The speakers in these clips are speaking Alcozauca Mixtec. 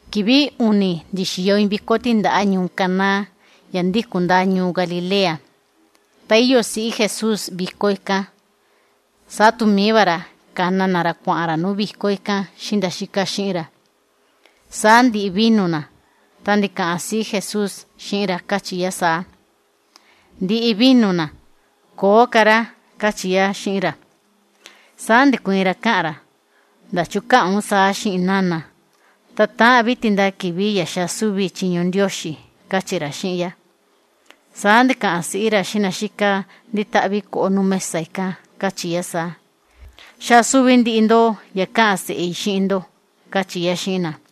Kivi uni ndi̱xiyo iin viko tíndaꞌa ñuu Caná, estado Galilea, ta ndi̱xaa tu siꞌí Jesús va íyo yá nuu viko ikán. Saa tu mií va ra ka̱na na ra kuaꞌan ra nuu viko ikán xiꞌin nda ítaꞌan xiꞌin ra. Saa ndi̱ꞌi vino na, ta ndi̱kaꞌan siꞌí Jesús xiꞌin ra, káchi yá saa: ―Ndi̱ꞌi vino na, köo ka rá ―káchi yá xiꞌin ra. Saa ndi̱kuiin ra káꞌan ra: ―¿Nana, ndachu káꞌan un saa xiꞌin i? Ta täꞌan vi tindaa kivi ya xaa súvi i chiñu Ndioxi ―káchi ra xiꞌin yá. Saa ndi̱kaꞌan siꞌí ra xiꞌin na xíka ndítaꞌvi koꞌo nuu mesa ikán, káchi yá saa: ―Xaa súvi ndiꞌi ndo ya káꞌan ra xiꞌin ndo ―káchi yá xiꞌin na.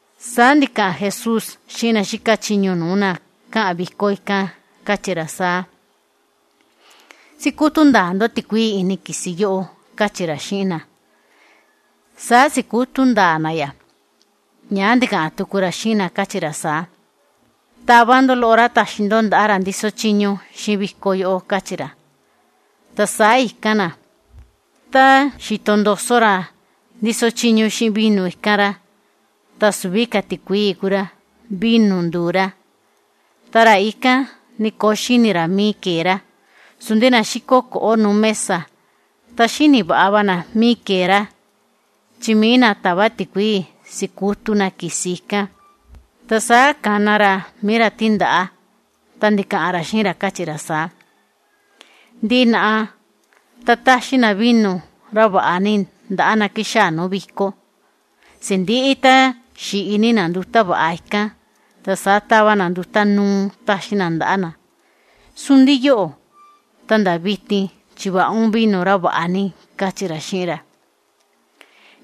Saa ndi̱kaꞌan Jesús xiꞌin na xíka chiñu nuu na káꞌan viko ikán, káchi ra saa: ―Sikutu ndaa ndo tikuii ini kisi yóꞌó ―káchi ra xiꞌin na. Saa si̱kutu ndaa na ya. Ñaa ndi̱kaꞌan tuku ra xiꞌin na, káchi ra saa: ―Tava ndo loꞌo rá taxi ndo ndaꞌa ra ndíso chiñu xiꞌin viko yóꞌó ―káchi ra. Ta saa i̱kan na. Tá xi̱to ndoso ra ndíso chiñu xiꞌin viko ikán rá ta süvi ka tikuii ku rá, vino ndu̱u rá. Ta ra ikán ni köo xíni ra míí ke̱e rá, sundi na xíko koꞌo nuu mesa ta xíni vaꞌa va na míí ke̱e rá, chi mií na ta̱va tikuii si̱kutu na kisi ikán. Saa ka̱na ra mií ra tíndaꞌa ikán, ndi̱kaꞌan ra xiꞌin ra, káchi ra saa: ―Ndiꞌi naꞌa ta táxi na vino rá vaꞌa ni ndaꞌa na xáa nuu viko. Sindiꞌi tá xi̱ꞌi ni na ndi̱xini na, ta saa táva na nduta núú táxi na ndaꞌa na. Sundi yóꞌo̱ ta nda vitin chi̱vaꞌa un vino rá vaꞌa ni ―káchi ra xiꞌin ra.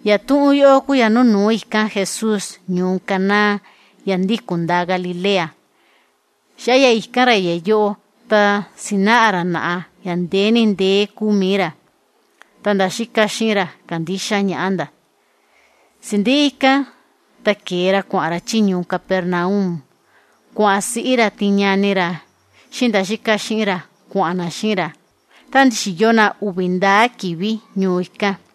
Yatuꞌun yóꞌó ku ya núnu̱ú i̱kan Jesús ñuu Caná, estado Galilea. Xaꞌa ya i̱kan ra ya yóꞌó ta si̱naꞌa ra naꞌa ya ndee ni ndee kúu mií ra. Ta ka̱ndixa ñaꞌa nda ítaꞌan xiꞌin ra. Sindiꞌi ikán ta ke̱e ra kuaꞌan ra chí ñuu Capernaum, kuaꞌan siꞌí ra tin ñani ra xiꞌin nda ítaꞌan xiꞌin ra, saa ndi̱xiyo na uvi ndaá kivi ñuu ikán.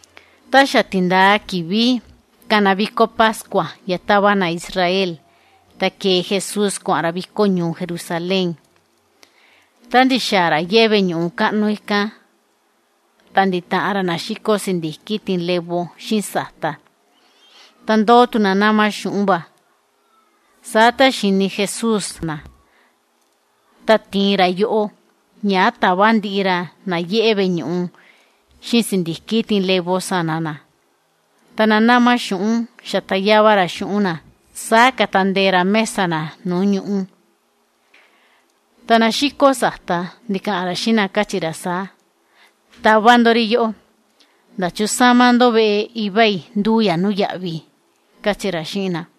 Tá xa tindaa kivi kana viko pascua ya táva na judío ta ke̱e Jesús kuaꞌan ra viko ñuu Jerusalén. Tá ndi̱xaa ra yeꞌe veꞌe ñuꞌu kaꞌnu ikán, ta ndi̱taꞌan ra na xíko sindiki tin levo xiꞌin sata. Ta ndóo tu na náma xuꞌun va. Saa tá xi̱ni Jesús na, ta ti̱in ra yoꞌó. Ñaa ta̱va ndiꞌi ra na yeꞌe veꞌe ñuꞌu xiꞌin sindiki tin levo sana na. Ta na náma xuꞌun xa̱ta yava ra xuꞌun na, saa ka̱ta ndee ra mesa na nuu ñuꞌú. Ta na xíko sata ndi̱kaꞌan ra xiꞌin na, káchi ra saa: ―¡Tava ndo ri yóꞌó ná kana koo ri kuꞌun ri! ¡Ta ndäsa ndo veꞌe Iva i ndúu ya nuu yaꞌvi! ―káchi ra xiꞌin na.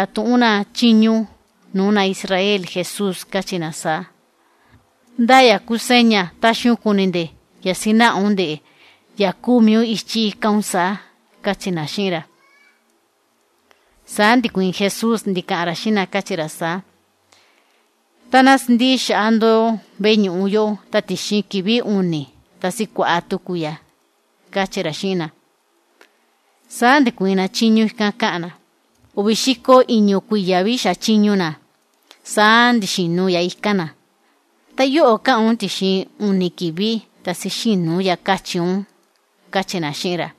Saa ndi̱ndakan tuꞌun nda chiñu nuu na judío Jesús káchi nda saa: ―¿Ndá yatuꞌun kua táxi un kuni nde ya kúu mií un ichí ikan un saa? ―káchi nda xiꞌin ra. Saa ndi̱kuiin Jesús ndi̱kaꞌan ra xiꞌin nda, káchi ra saa: ―Tá ná sindiꞌi xaꞌa ndo veꞌe ñuꞌu yóꞌó ta tixin kivi uni ta sikuaꞌa tuku i ya ―káchi ra xiꞌin nda. Saa ndi̱kuiin nda chiñu ikan káꞌan nda: ―Uvi xiko iñu kuiya vi xa̱a chiñu na, saa ndi̱xinu ya i̱kan na. Ta ¿án ndixa kua tixin uni kivi ta sixinu un ya? ―káchi nda xiꞌin ra xáa siki ñaꞌa nda.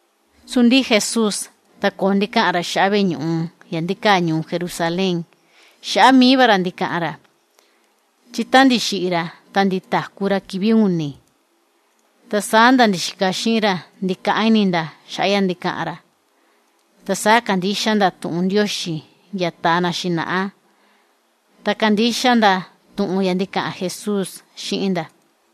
Sundi Jesús ta köo ndi̱kaꞌan ra xaꞌa veꞌe ñuꞌu ya ndíkaa ñuu Jerusalén, xaꞌa ikin kuñu va ra kua ndi̱kaꞌan ra. Chi tá ndi̱xiꞌi ra ta ndi̱taku ra kivi uni, ta saa ndi̱kaꞌán ini nda xi̱taꞌan xiꞌin ra xaꞌa tuꞌun yóꞌó. Ta saa ka̱ndixa nda tuꞌun Ndioxi ya ta̱a na xinaꞌa, ta ka̱ndixa tu nda tuꞌun ya ndi̱kaꞌan Jesús xiꞌin va nda.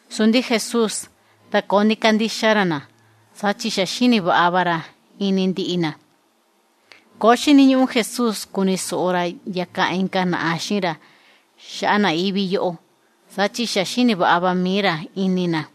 Sundi Jesús ta köo ndi̱kandixa ra na, saa chi xa xíni vaꞌa va ra ini ndiꞌi na. Köo ndi̱xiniñuꞌu Jesús kuni soꞌo ra ya kaꞌan inka naꞌa xiꞌin ra xaꞌa na ivi yóꞌó, saa chi xa xíni vaꞌa va mií ra ini na.